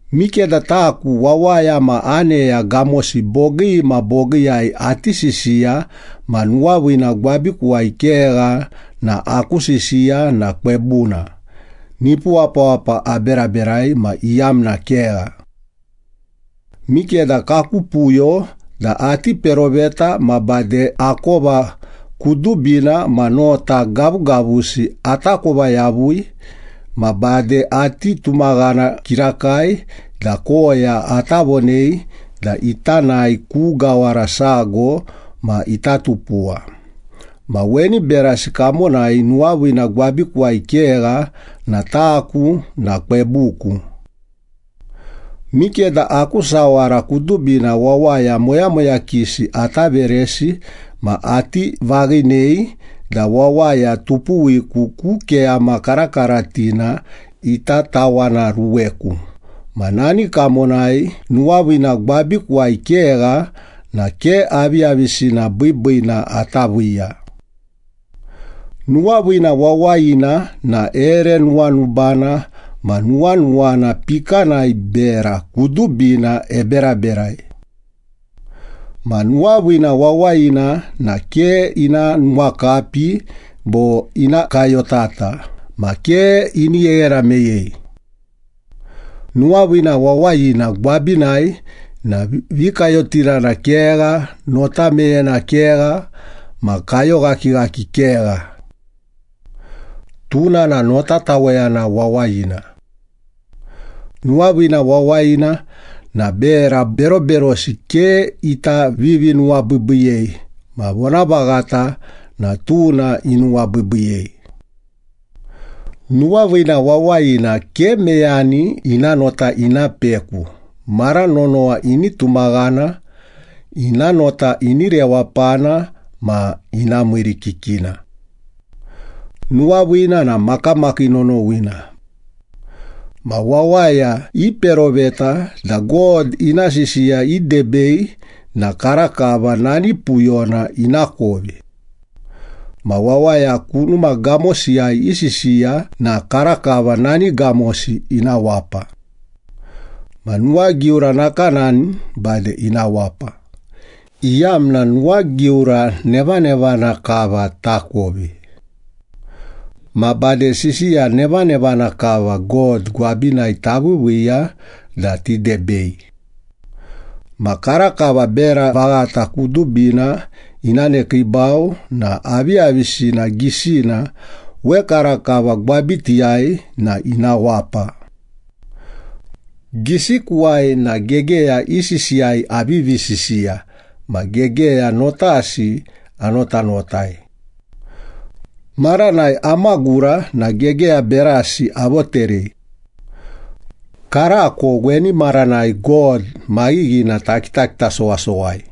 Mikeda taku, wawaya ma aneya gamosi bogii ma bogiiyai ati sisiya ma nuwaviina gwabikuwai kegha na aku sisiya na kwebuna, nipu wapawapa aberaberai ma iyamna kegha. Mikeda kaku puyo da ati peroveta ma bade akova kudubina ma nota gavugavusi atakova yavui, ma bade ati tumaghana kirakai da koya ata vonei da ita nae ku gawara sago ma ita tupuwa, ma weni berasi kamonai nuwaviina gwabikuwai kegha na taku na kwebuku. Mikeda aku sawara kudubina wawaya moyamoyakisi ata veresi, ma ati vaghinei da wawaya tupuwiku ku keyama karakaratina ita tawanaruweku ma nani kamonai nuwaviina gwabikuwai kegha na ke aviyavisina biibiina ata viiya. Nuwaviina wawayina na ere nuwanubana ma nuwanuwana pikanai bera kudubina eberaberai. Ma nuwaviina wawayina na ke ina nuwakapi bo ina kayotata ma ke ini gheghena meyei. Nuwaviina wawayina gwabinai na vikayotirana kegha, nota meyena kegha, ma kayoghakighaki kegha. Tuna na notataweyana wawayina. Nuwaviina wawayina na bera beroberosi ke ita vivinuwabiibiiyei, ma vonavaghata na tuna ini nuwabiibiiyei. Nuwaviina wawayina ke meyani ina nota ina peku, mara nonowa ini tumaghana, ina nota ini rewapana, ma ina miirikikina. Nuwaviina na makamakii nonowina. Ma wawaya iperoveta da God ina sisiya idebei na karakava nani puyona ina kovi. Ma wawaya kunuma gamosiyai isisiya na karakava nani gamosi ina wapa. Ma nuwagiura nakanani, bade ina wapa, iyamna nuwagiura nevanevana kava takovi. Ma bade sisiya nevanevana kava God gwabinai taviiviiya da tidebei. Ma karakava bera vaghata kudubina ina nekiibau na aviyavisina gisina wekarakava gwabitiyai na ina wapa. Gisikuwai na gegeya i sisiyai avivi sisiya ma gegeya notasi anotanotai. Maranai amagura na gegeya berasi avoterei. Karako weni maranai God maghighina takitakita sowasowai.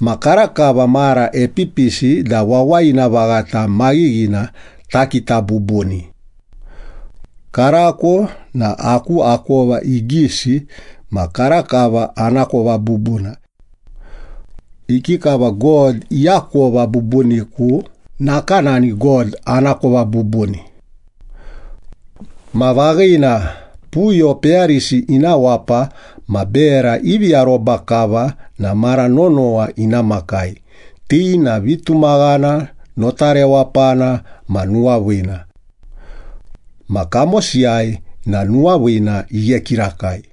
Ma karakava mara epipisi da wawayina vaghata maghighina takita bubuni. Karako na aku akova igisi ma karakava anakova bubuna. Ikikava God iakova bubuniku, nakanani God anakova bubuni. Ma vaghina, puyo peyarisi ina wapa ma bera ivi aroba kava na mara nonowa ina makai, ti na vitumaghana, nota rewapana ma nuwaviina. Ma kamosiyai na nuwaviina ighe kirakai.